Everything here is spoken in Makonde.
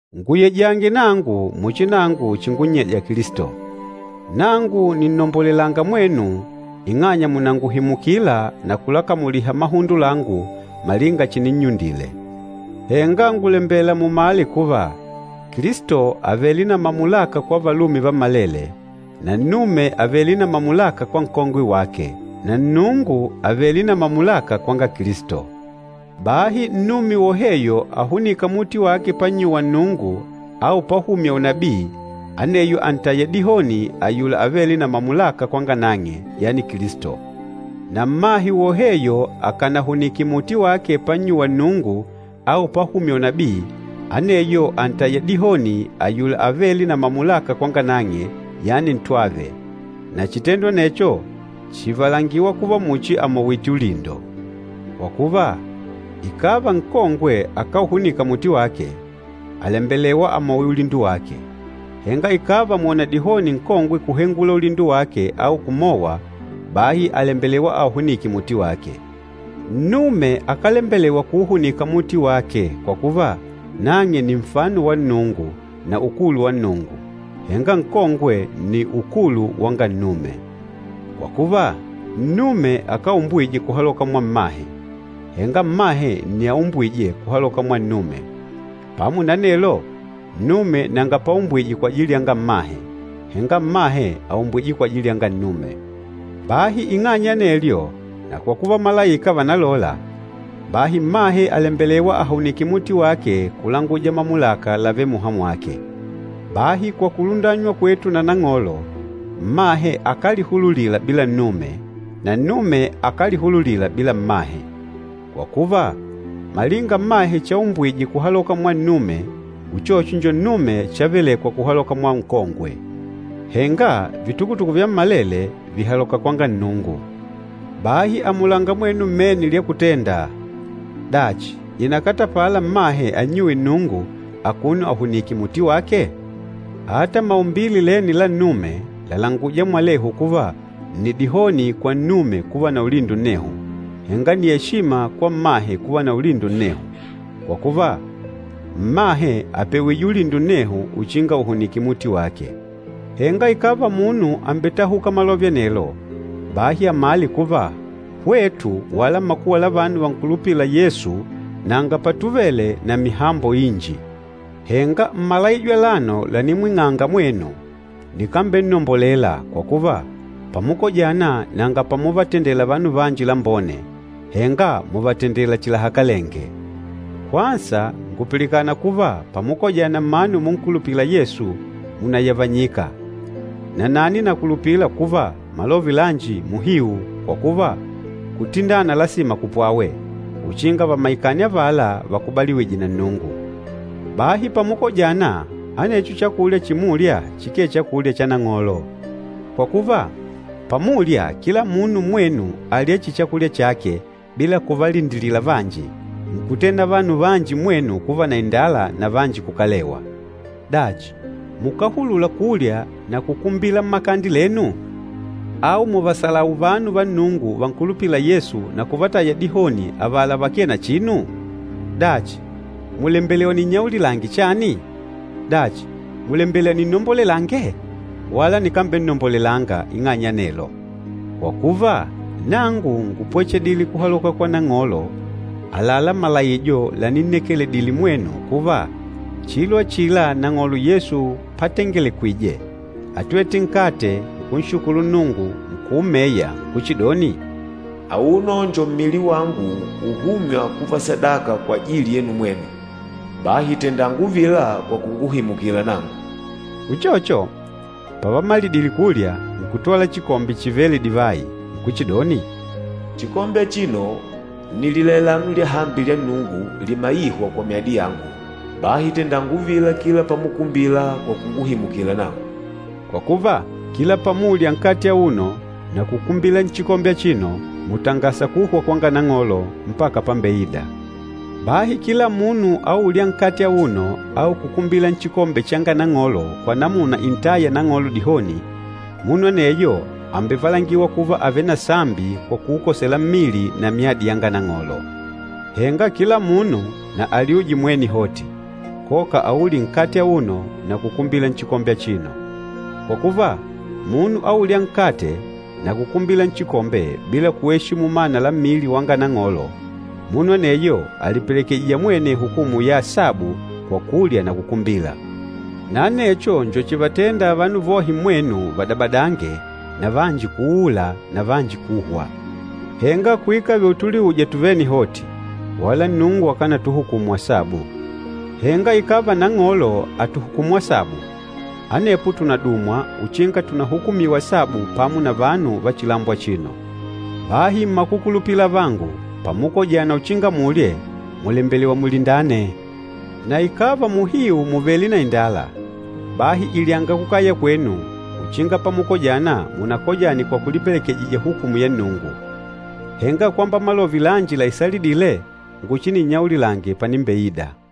Nguyejange nangu muchi nangu chingunnyeja Kilisto. Nangu nìnnombolelanga mwenu ing'anya mùnanguhimukila na kulakamuliha mahundo langu malinga chininnyundile. Henga ngùlembela mumale kuva, Kilisto àvele na mamulaka kwa valume vammalele, na nnume àvele na mamulaka kwa nkongwe wake, na Nnungu àvele na mamulaka kwanga Kilisto. Bahi nnume woheyo ahunîka muti wake pannyuwa Nnungu au pahumya unabii, aneyo àntaya dihoni ayula avêle na mamulaka kwanga nang'e, yani Kilisto. Na mmahe woheyo akanahunike muti wake pannyuwa Nnungu au pahumya unabii, aneyo àntaya dihoni ayula avêle na mamulaka kwanga nang'e, yani ntwave. Na chitendo anecho chìvalangiwa kuva muchi àmowite ulindo. Kwa kuva, ikàva nkongwe akáuhunika muti wake, àlembelewa amowe ulindo wake. Henga ikàva mwòna dihoni nkongwe kuhengula ulindo wake au kumowa, bahi àlembelewa auhunike muti wake. Nnume akálembelewa kuuhunika muti wake kwa kuva, nang'e nni nfano wa Nnungu na ukulu wa Nnungu, henga nkongwe nni ukulu wanga nnume. Kwa kuva, nnume akáumbwije kuhaloka mwa mmahe, henga mmahe nni aumbwîje kuhaloka mwa nnume. Pamo na anelo, nnume nanga paumbwije kwajili yanga mmahe, henga mmahe àumbwija kwajili yanga nnume. Bahi ing'anya ya anelyo, na kwa kuva malaika vànalola, bahi mmahe àlembelewa ahunike muti wake kulanguja mamulaka lavêle muha mwake. Bahi kwa kulundanywa kwetu na Nang'olo, mmahe akálihululila bila nnume na nnume akálihululila bila mmahe. Kwa kuva, malinga mmahe chaumbwije kuhaloka mwa nnume, uchocho njo nnume chavelekwa kuhaloka mwa nkongwe. Henga vitukutuku vyammalele vìhaloka kwanga Nnungu. Bahi amulanga mwenu mmene lya kutenda, dachi ìnakatapala mmahe annyuwe Nnungu akuno akahunìkè muti wake? Ata maumbile lene la nnume làlanguja mwalehu kuva nni dihoni kwa nnume kuva na ulindo nnehu, henga nni eshima kwa mmahe kuva na ulindo nnehu. Kwa kuva, mmahe àpewije ulindo nnehu uchinga ahunike muti wake. Henga ikàva munu àmbetahuka malove anelo, bahi amale kuva, hwetu wala makuwa la vanu vankulupîla Yesu nanga patuvele na mihambo inji. Henga mmalaijo alano lanimwing'anga mwenu, nikambennombolela, kwa kuva, pamukojana nanga pamuvatendela vanu vanji lambone, henga mùvatendela chihi lahakalenge. Kwansa ngùpilikana kuva pamukojana mmanu munkulupîla Yesu, mùnayavanyika. Nanani nakulupila kuva malove lanji muhiu, kwa kuva, kutindana lasima kupwawe, uchinga vamaikane avala vakubaliwîje na Nnungu. Bahi pamukojana, anecho chakulya chimulya chikee Chakulya cha Nang'olo. Kwa kuva, pamulya, kila munu mmwenu àlya chihi chakulya chake bila kuvalindilila vanji, nkutenda vanu vanji mmwenu kuva na indala na vanji kukalewa. Dachi, mukáhulula kulya na kukumbila mmakande lenu? Au mùvahebula vanu va Nnungu vankulupîla Yesu na kuvataya dihoni avala vakee na chinu? Dachi, mùlembela ninnyaulilange chani? Dachi, mùlembela ninnombolelange? Wala nikambennombolelanga ing'anya ya anelo. Kwa kuva, nangu ngúpwechedile kuhaloka kwa Nang'olo àlalá malaijo laninnekeledile mwenu kuva, chilo achila Nang'olo Yesu patengelekwije, átwete nkate, nkunshukulu Nnungu, nkuumeya nkuchidoni, “Auno njo mmili wangu uhûmywa kuva sadaka kwajili yenu mwenu. Bahi tendanga uvila kwa kunguhimukila nangu.” Uchocho, pavamalidile kulya, nkutwala chikombe chivêle divayi, nkuchidoni, “Chikombe achino nni lilailano lyahambi lya Nnungu, limaîhwa kwa myadi yangu. Bahi tendanga uvila kila pamukumbila kwa kunguhimukila nangu.” Kwa kuva, kila pamulya nkate auno na kukumbila nchikombe achino, mùtangasa kuhwa kwanga Nang'olo mpaka pambeida. Bahi kila munu aûlya nkate auno au kukumbila nchikombe changa Nang'olo kwa namuna intâya Nang'olo dihoni, munu aneyo àmbevalangiwa kuva àvele na sambi kwa kuukosela mmili na myadi yanga Nang'olo. Henga kila munu na alyuje mwene hoti, koka aulye nkate auno na kukumbila nchikombe achino. Kwa kuva, munu aûlya nkate na kukumbila nchikombe bila kueshimu mana la mmili wanga Nang'olo, munu aneyo àlipelekejija mwene hukumu ya asabu kwa kulya na kukumbila. Na anecho njo chivatênda vanu vohe mmwenu vadabadange na vanji kuuula na vanji kuhwa. Henga kuikave utuliuja tuvene hoti, wala Nnungu akánatuhukumu asabu. Henga ikàva Nang'olo àtuhukumu asabu, anepo tùnadumwa uchinga tunahukumiwe asabu pamo na vanu va chilambo achino. Bahi mmakukulupila avangu, pamukojana uchinga mulye, mùlembelewa mulindane. Na ikàva muhiu mùvele na indala, bahi ilyanga kukaya kwenu uchinga pamukojana munakojane kwa kulipelekejija hukumu ya Nnungu. Henga kwamba malove lanji laisalidîle nguchininnyaulilange panimbeida.